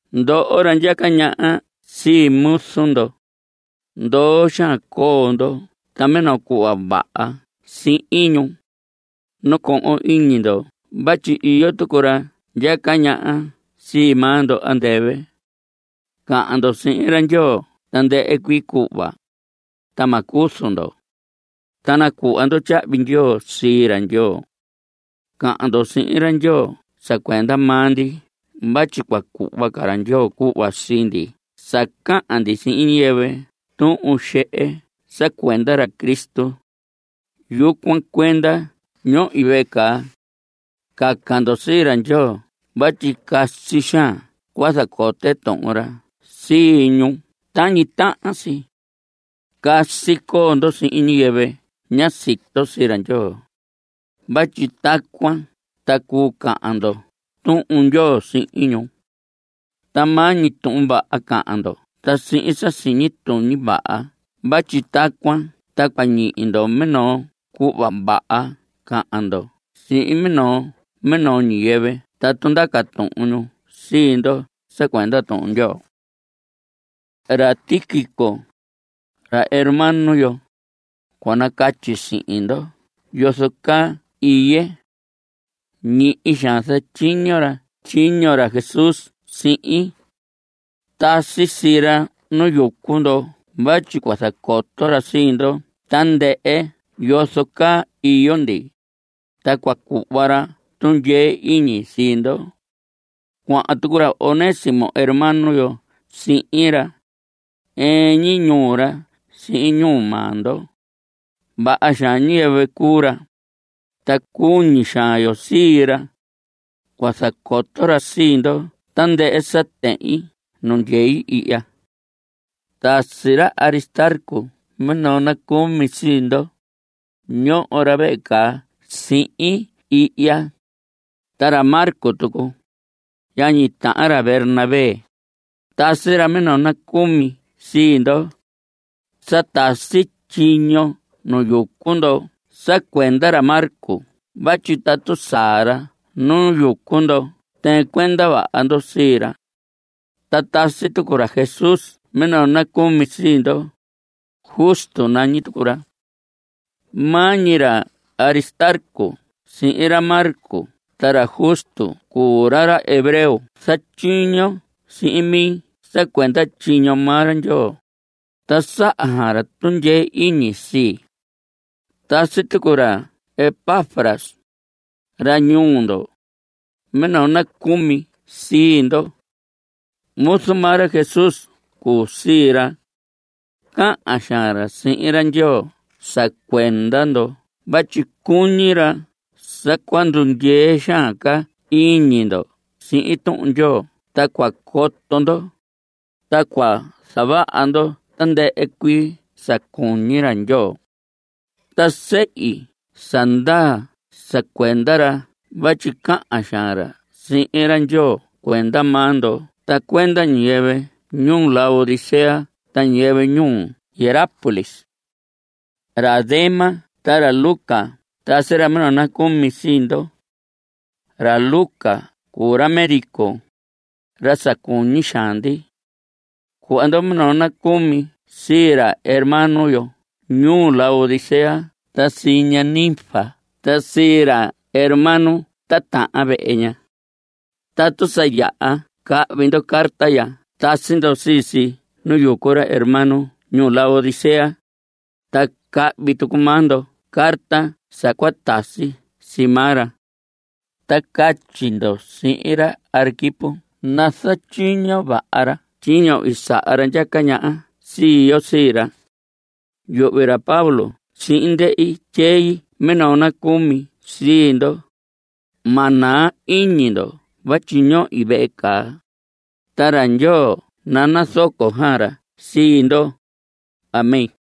Ndoho ra ndyaca ñaha sii muzu ndo, ndoo xaan coo ndo ta minoo cuhva vaha sihin ñu. Nacohon iñi ndo vatyi iyo tucu ra ndyaca ñaha sii maa ndo andɨvɨ. Cahan ndo sihin ra Ndyoo tandɨhɨ cuii cuhva, ta ma cuzu ndo. Ta nacuhva ndo tyahvi ndyoo sii ra Ndyoo. Cahan ndo sihin ra Ndyoo sa cuenda maa ndi vatyi cua cuhva ra Ndyoo cuhva sii ndi sa cahan ndi sihin ñiyɨvɨ tuhun xehe sa cuenda ra Cristo. Yucuan cuenda ñohi vehe caa. Caca ndo sii ra Ndyoo vatyi casi xaan cua zacote Tuhun ra sii ñu tañi tahan si. Casi coo ndo sihin ñiyɨvɨ ña sito sii ra Ndyoo, vatyi tacuan ta cuu cahan ndo Tuhun Ndyoo sihin ñu. Ta maa ñi tuhun vaha cahan ndo ta sihin sa siñi tuñi vaha vatyi tacuan ta cua ñihi ndo minoo cuhva vaha cahan ndo sihin minoo minoo ñiyɨvɨ tatu ndaca tuhun ñu sii ndo sa cuenda Tuhun Ndyoo. Ra Tíquico, ra hermano yo, cua nacatyi sihin ndo yozo caa iye. Ñihi xaan zatyiño ra tyiño ra Jesús sihin. Tasi sii ra nu yucu ndo vatyi cua zacoto ra sii ndo tandɨhɨ yozo caa iyo ndi, ta cua cuhva ra tundyee iñi sii ndo. Cuahan tucu ra Onésimo hermano yo sihin ra. Ɨɨn ñi ñuu ra sihin ñuu maa ndo. Vaha xaan ñiyɨvɨ cuu ra, ta cuñi xaan yo sii ra. Cua zacoto ra sii ndo tandɨhɨ sa tehin nu ndyei ihya. Tasi ra Aristarco minoo nacumi sii ndo. Ñoho ra vehe caa sihin ihya. Ta ra Marcos tucu, yañi tahan ra Bernabé, tasi ra minoo nacumi sii ndo. Sa tasi tyiño nu yucu ndo sa cuenda ra Marcos vatyi tatu saa ra nu yucu ndo tɨɨn cuenda vaha ndo sii ra. Ta tasi tucu ra Jesús minoo nacumi sii ndo. Justo nañi tucu ra. Maa ñi ra Aristarco sihin ra Marcos ta ra Justo cuu ra ra hebreo ra zatyiño sihin mi sa cuenda tyiño maa ra Ndyoo, ta saha xaan ra tundyee iñi sii. Tasi tucu ra Epafras, ra ñuu ndo, minoo nacumi sii ndo. Muzu maa ra Jesús cuu sii ra. Cahan xaan ra sihin ra Ndyoo sa cuenda ndo vatyi cuñi ra sa cua ndundyee xaan ca iñi ndo sihin Tuhun Ndyoo ta cua coto ndo, ta cua zavaha ndo tandɨhɨ cuii sa cuñi ra Ndyoo. Ta sehi sa ndaa sa cuenda ra vatyi cahan xaan ra sihin ra Ndyoo cuenda maa ndo ta cuenda ñiyɨvɨ ñuu Laodicea ta ñiyɨvɨ ñuu Hierápolis. Ra Demas ta ra Lucas tasi ra minoo nacumi sii ndo. Ra Lucas cuu ra médico, ra sa cuñi xaan ndi. Cuhva ndo minoo nacumi sii ra hermano yo ñuu Laodicea ta sii ña Ninfas ta sii ra hermano titahan vehe ña. Tatu sa yaha cahvi ndo carta ya tasi ndo sii si nu yucu ra hermano ñuu Laodicea, ta cahvi tucu maa ndo carta sa cua tasi sii maa ra. Ta catyi ndo sihin ra Arquipo nazatyiño vaha ra tyiño i saha ra ndyaca ñaha sii yo sii ra. Yuhvi ra Pablo sihin ndehi tyei minoo nacumi sii ndo. Ma naa iñi ndo vatyi ñohi vehe caa. Ta ra Ndyoo nanazoco xaan ra sii ndo. Amén.